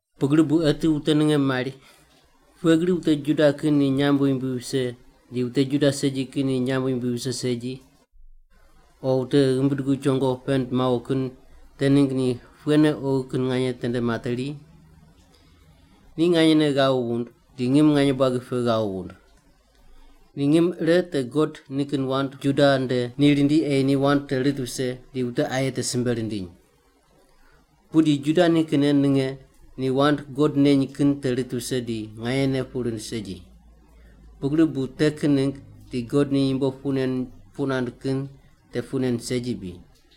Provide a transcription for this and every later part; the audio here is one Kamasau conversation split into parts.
Pugri bu eti wute ninge mari, “Pughe gri wute Juda kin ni nyamb yumbui vise di wute Juda segi kin ni nyamb yumbui vise segi? O wute ghimbi dugu chongo pend mawo kin te ningg ni pughene oghi kin nganye tende materi?” Ni nganyene ghav wund, di ngim nganye buagi pe ghav wund! Ni ngim ire te God nikin wand Juda nde ni rindi ei ni wand te rit vise di wute aye te simbe rindiny. Pudi Juda nikinne ninge ni wand God neny kin te rit vise di nganyene puq rind segi. Pugri bu te kin ningg di God ni yumbo puq nen puq nand kin te puq nen segi bri?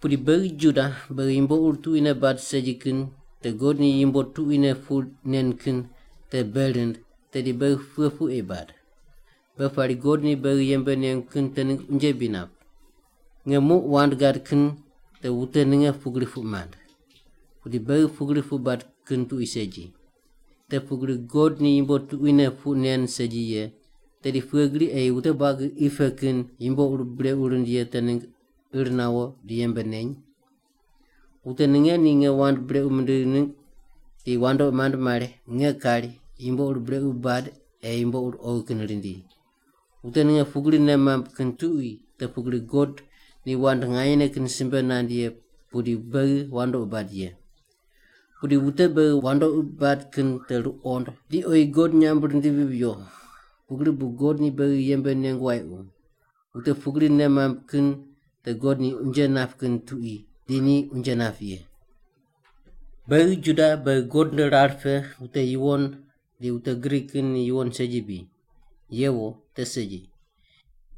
Pudi beghi Juda, beghi yumbo ur tuquine bad segi kin te God ni yumbo tuquine puq nen kin te bei rind, tedi beghi pughe puq ei bad? Beghi pari God ni beghi yembe nengu kin te ningg unje bri nap? (Nge muq wand gad kin te wute ninge pugri puq mand.) Pudi beghi pugri puq bad kin tuqui segi! Te pugri God ni yumbo tuquine puq nen segi ye, tedi pughe gri ei wute buagi qi pe kin yumbo ur brequ rind ye te ningg ir nawo di yembe neny? Wute ninge ni nge wand brequ mindig ningg di wandoqi mand mari nge kari, “Yumbo ur brequ bad ei yumbo ur oghi kin rindi.” Wute ninge pugri nei mamb kin tuqui te pugri God ni wand nganyene kin simbe nand ye pudi beghi wandoqi bad ye. Pudi wute beghi wandoqi bad kin te ruqond di ni oyi God nyamb rindivi viyo, pugri bu God ni beghi yembe nengu wayequ. Wute pugri nei mamb kin te God ni unje nap kin tuqui, di ni unje nap ye. Beghi Juda beghi God nde rar pe wute yuwon di wute Grik kin ni yuwon segi bri? Yewo, te segi!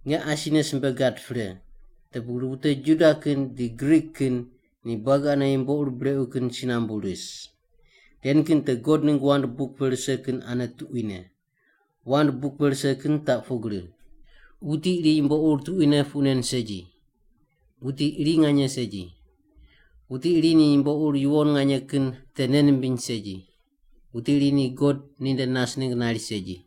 Nge asine simbe gad pre, te pugri wute Juda kin di Grik kin ni buagi ane yumbo ur brequ kin si nambu ris. Ren kin te God ningg wand buk pe rise kin ane tuquine. Wand buk pe rise kin taq pugri: “Wuti iri yumbo ur tuquine puq nen segi! Wuti iri nganye segi! Wuti iri ni yumbo ur yuwon nganye kin te nei nimbiny segi; Wuti iri ni God ninde nas ningg nari segi.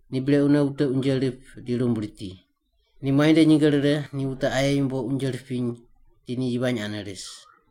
“Ni brequne wute unje rip di rumb riti; Ni muai nde nyinge rire ni wute aye yumbo unje ripiny di ni yivany ane ris.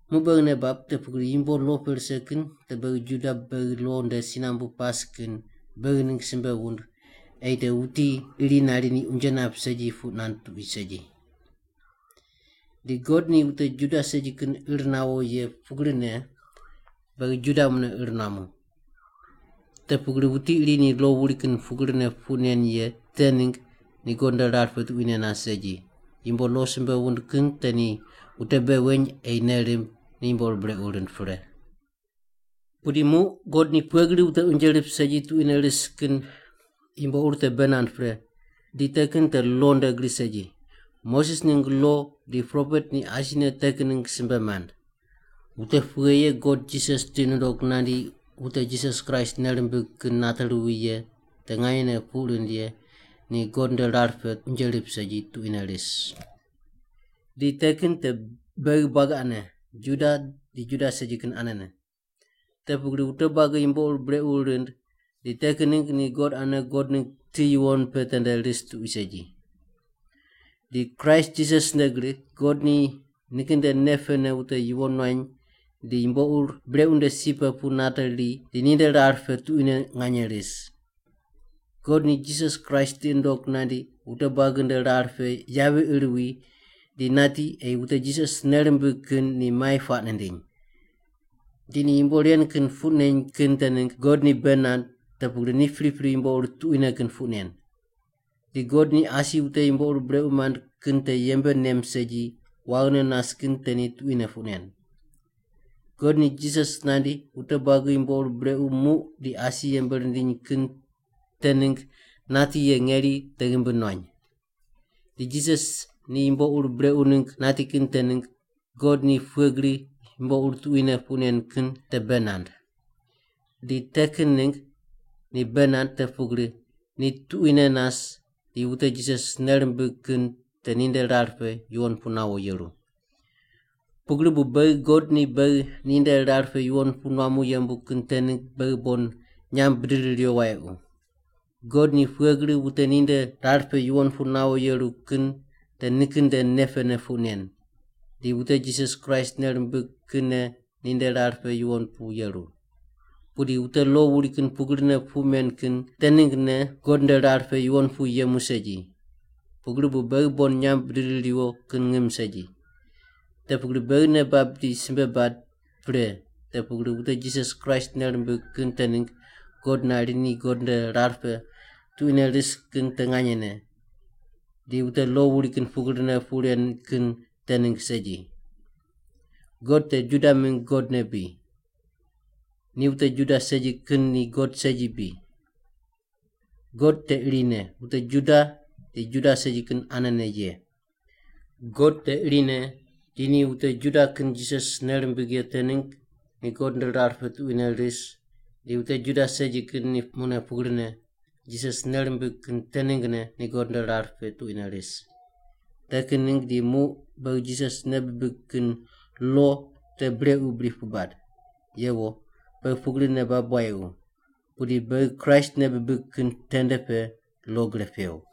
Muq beghi nei bab te pugri yumbo lo pe rise kin te beghi Juda beghi lo nde si nambu pas kin beghi ningg simbe wund ei te wuti iri nari ni unje nap segi puq nand tuqui segi. Di God ni wute Juda segi kin ir nawo ye pugrine, beghi Juda mune ir nuamu. Te pugri wuti iri ni lo wuri kin pugrine puq nen ye te ningg ni God nde rar pe tuquine nas segi, yumbo lo simbe wund kin te ni wute bei weny ei nei rimb ni yumbo ur brequ rind pre. Pudi muq God ni pughe gri wute unje rip segi tuquine ris kin yumbo ur te bei nand pre, di te kin te lo nde gri segi. Moses ningg lo di propet ni asine te kin ningg simbe mand. Wute pughe ye God Jisas tiqi nundoq nandi wute Jisas Kraist nei rimbig kin nate ruwi ye te nganyene puq rind ye ni God nde rar pe unje rip segi tuquine ris. Di te kin te beghi buagi ane, Juda di Juda segi kin anene. Te pugri wute buagi yumbo ur brequ rind di te kin ningg ni God ane God ningg ti yuwon pe tende ris tuqui segi. Di Kraist Jisas nde gri God ni nikin nde nei pene wute yuwon nuany di yumbo ur brequ nde si pe pu nateri di ninde rar pe tuquine nganye ris. God ni Jisas Kraist tiqi nundog nandi wute buagi nde rar pe yavi ir wi di nati ei wute Jisas nei rimbig kin ni mai puaq nindiny. Di ni yumbo ren kin puq neny kin te ningg God ni bei nand te pugri ni pripri yumbo ur tuquine kin puq nen. Di God ni asi wute yumbo ur brequ mand kin te yembe nem segi waghine nas kin te ni tuquine puq nen. God ni Jisas nandi wute buagi yumbo ur brequ muq di asi yembe rindiny kin te ningg nati ye ngeri te ghimbi nuany. Di Jisas ni yumbo ur brequ ningg nati kin te ningg God ni pughe gri yumbo ur tuquine puq nen kin te bei nand. Di te kin ningg ni bei nand te pugri ni tuquine nas di wute Jisas nei rimbig kin te ninde rar pe yuwon pu nawo yeru. Pugri bu beghi God ni beghi ni nde rar pe yuwon pu nuamu yembu kin te ningg beghi bon nyamb bidiri riwo wayequ. God ni pughe gri wute ninde rar pe yuwon pu nawo yeru kin te nikin nde nei pene puq nen, di wute Jisas Kraist nei rimbig kinne ninde rar pe yuwon pu yeru. Pudi wute lo wuri kin pugrine puq men kin te ninggne God nde rar pe yuwon pu yemu segi, pugri bu beghi bon nyamb bidiri riwo kin ngim segi. Te pugri beghi nei bab di simbe bad pre te pugri wute Jisas Kraist nei rimbig kin te ningg God nari ni God nde rar pe tuquine ris kin te nganyene, di wute lo wuri kin pugrine puq ren kin te ningg segi. God te Juda mingg God ne bri? Ni wute Juda segi kin ni God segi bri? God te irine wute Juda di Juda segi kin anene ye. God te irine di ni wute Juda kin Jisas nei rimbig ye te ningg ni God nde rar pe tuquine ris di wute Juda segi kin ni mune pugrine Jisas nei rimbig kin te ninggne ni God nde rar pe tuquine ris. Te kin ningg di muq beghi Jisas ne nei bibig di lo te brequ bri puq bad? Yewo, beghi pugri nei bab wayequ! Pudi beghi Kraist nei bibig kin tende pe lo gre pew.